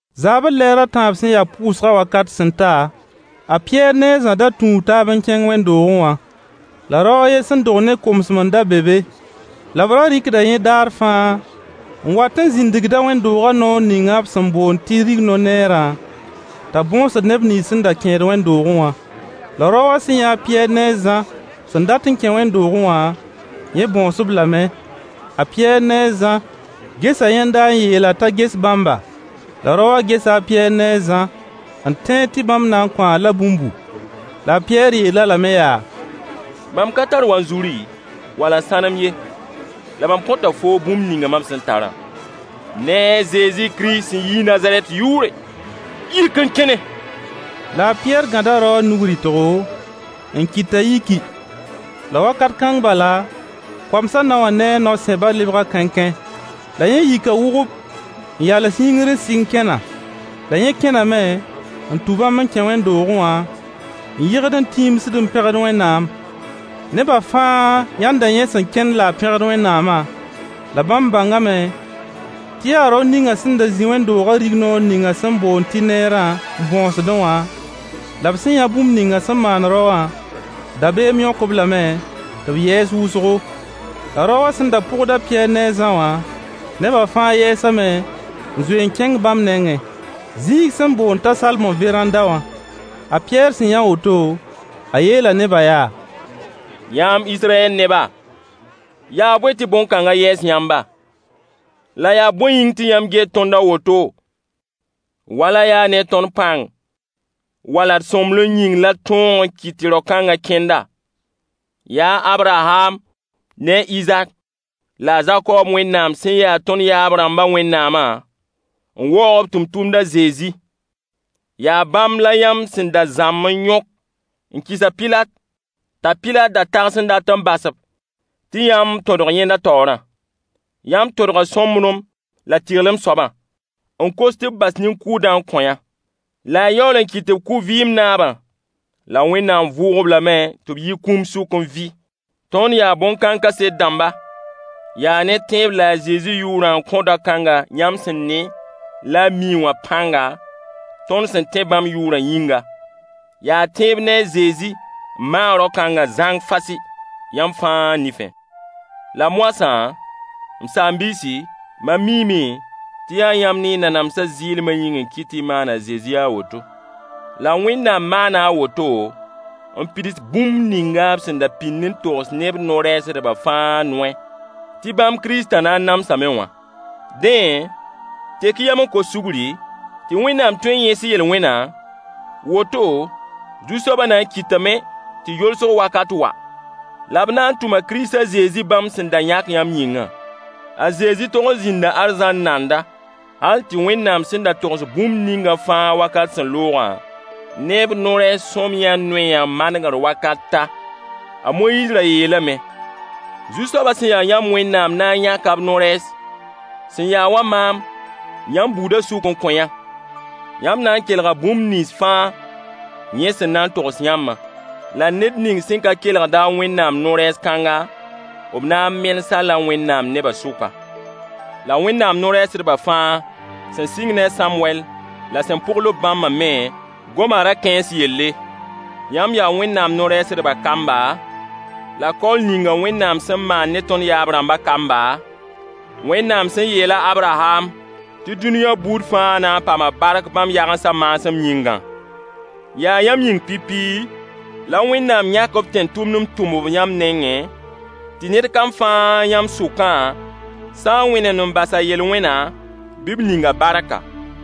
Zaabr lɛɛr a tãab sẽn ya pʋʋsgã wakat sẽn ta, a Pɩyɛɛr ne a Zã da tũu taab n kẽng wẽnd-doogẽ wã. La rao a ye sẽn dog ne komsem n da be be. La b ra rɩkda yẽ daar fãa n wat n zĩndgd-a wẽnd-doogã noor ninga b sẽn boond tɩ rigno-neerã t'a bõosd neb nins sẽn da kẽed wẽnd-doogẽ wã. La rao wã sẽn yã a Pɩyɛɛr ne a Zã sẽn dat n kẽ wẽnd-doogẽ wã, yẽ bõos-b lame. A Pɩyɛɛr ne a Zã gesa yẽnda n yeel-a t'a ges bãmba. La rao wã gesa a Pɩyɛɛr ne a zã n tẽed tɩ bãmb na n kõ-a-la bũmbu. La a Pɩyɛɛr yeel-a lame yaa: Mam ka tar wanzuri wala sãnem ye, la mam kõta foo bũmb ninga mam sẽn tarã, ne a Zezi Kirist sẽn yi Nazarɛt yʋʋre, yik n kẽne! La a Pɩyɛɛr gãda rao wã nug-rɩtgo, n kɩt t'a yiki. La wakat kãng bala koamsã nao wã ne a nao-sẽbã lebga kãenkãe. La yẽ yika wʋgʋp n yals yĩngr n sɩng kẽna. La yẽ kẽname n tũ bãmb n kẽ wẽnd-doogẽ wã n yɩgd n tiimsid n pẽgd Wẽnnaam. Nebã fãa yãnda yẽ sẽn kẽnd la a pẽgd Wẽnnaamã. La bãmb bãngame tɩ yaa rao ninga sẽn da zĩ wẽnd-doogã rignoor ninga sẽn boond tɩ neerã n bõosdẽ wã, la b sẽn yã bũmb ninga sẽn maan rao wã, dabeem yõk-b lame tɩ b yɛɛs wʋsgo. La rao wã sẽn da pʋgd a Pɩyɛɛr ne a Zã wã, neba fãa yɛɛsame n zoe n kẽng bãmb nengẽ, zĩig sẽn boond t'a Salmo veranda wã. A Pɩyɛɛr sẽn yã woto, a yeela nebã yaa: Yãmb Israyɛl neba, yaa bõe tɩ bõn-kãnga yɛɛs yãmba? La yaa bõe yĩng tɩ yãmb get tõnd a woto wala yaa ne tõnd pãng wala d sõmblem yĩng la d tõog n kɩt rao-kãnga kẽnda? Yaa Abraham ne Izak la a Zakob Wẽnnaam sẽn ya tõnd yaab-rãmba Wẽnnaamã n waoog b tẽn-tʋmd a Zezi. Yaa bãmb la yãmb sẽn da zãmb n yõk n kɩs a Pilat, t'a Pilat da tags n dat n bas-b tɩ yãmb tõdg yẽnda taoorã. Yãmb tõdga sõmblem la tɩrlem soabã, n kos tɩ b bas nin-kʋʋdã n kõ-yã. La y yaool n kɩt tɩ b kʋ vɩɩm-naabã. La Wẽnnaam vʋʋg-b lame tɩ b yi kũum sʋk n vɩ. Tõnd yaa bõn-kãng kaset dãmba. Yaa ne tẽeb la a Zezi yʋʋrã n kõ dao kãngã yãmb sẽn ne la y miẽ wã pãnga tõnd sẽn tẽe bãmb yʋʋrã yĩnga. Yaa tẽeb ne a Zezi n maag rao-kãnga zãng fasɩ yãmb fãa nifẽ. La moasã, m saam-biisi, mam miime tɩ yaa yãmb ne y nanamsa zɩɩlma yĩng n kɩt tɩ y maan a Zezi a woto. La Wẽnnaam maana a woto n pids bũmb ninga b sẽn da pĩnd n togs ne b no-rɛɛsdbã fãa noy tɩ bãmb Kiristã na n namsame wã. Dẽ, tek-y yam n kos sugri tɩ Wẽnnaam tõe n yẽes y yel-wẽna, woto, Zu-soaba na n kɩtame tɩ yolsg wakat wa. La b na n tʋma Kirist a Zezi bãmb sẽn da yãk yãmb yĩngã. A Zezi tog zĩnda arzãn nanda hal tɩ Wẽnnaam sẽn da togs bũmb ningã fãa wakat sẽn loogã ne b no-rɛɛs sõamyã noyã manegre wakat ta. A Moyiis ra yeelame: “Zu-soaba sẽn ya yãmb Wẽnnaam na n yãka b no-rɛɛs sẽn ya wa maam yãmb buudã sʋk n kõ-yã. Yãmb na n kelga bũmb nins fãa yẽ sẽn na n togs yãmbã. La ned ning sẽn ka kelgd-a Wẽnnaam no-rɛɛs kãnga, b na n menes-a-la Wẽnnaam nebã sʋka.” La Wẽnnaam no-rɛɛsdbã fãa sẽn sɩng ne a Sãmwɛll la sẽn pʋgl-b bãmba me goma ra-kãens yelle. Yãmb yaa Wẽnnaam no-rɛɛsdba kamba, la kaool ninga Wẽnnaam sẽn maan ne tõnd yaab-rãmbã kamba, Wẽnnaam sẽn yeela Abraham tɩ dũniyã buud fãa na n paama bark bãmb yagensã maasem yĩngã. Yaa yãmb yĩng pipi la Wẽnnaam yãk b tẽn-tʋmd n tʋm-b yãmb nengẽ, tɩ ned kam fãa yãmb sʋkã sã n wẽnemd n bas a yel-wẽna bɩ b ning-a barka.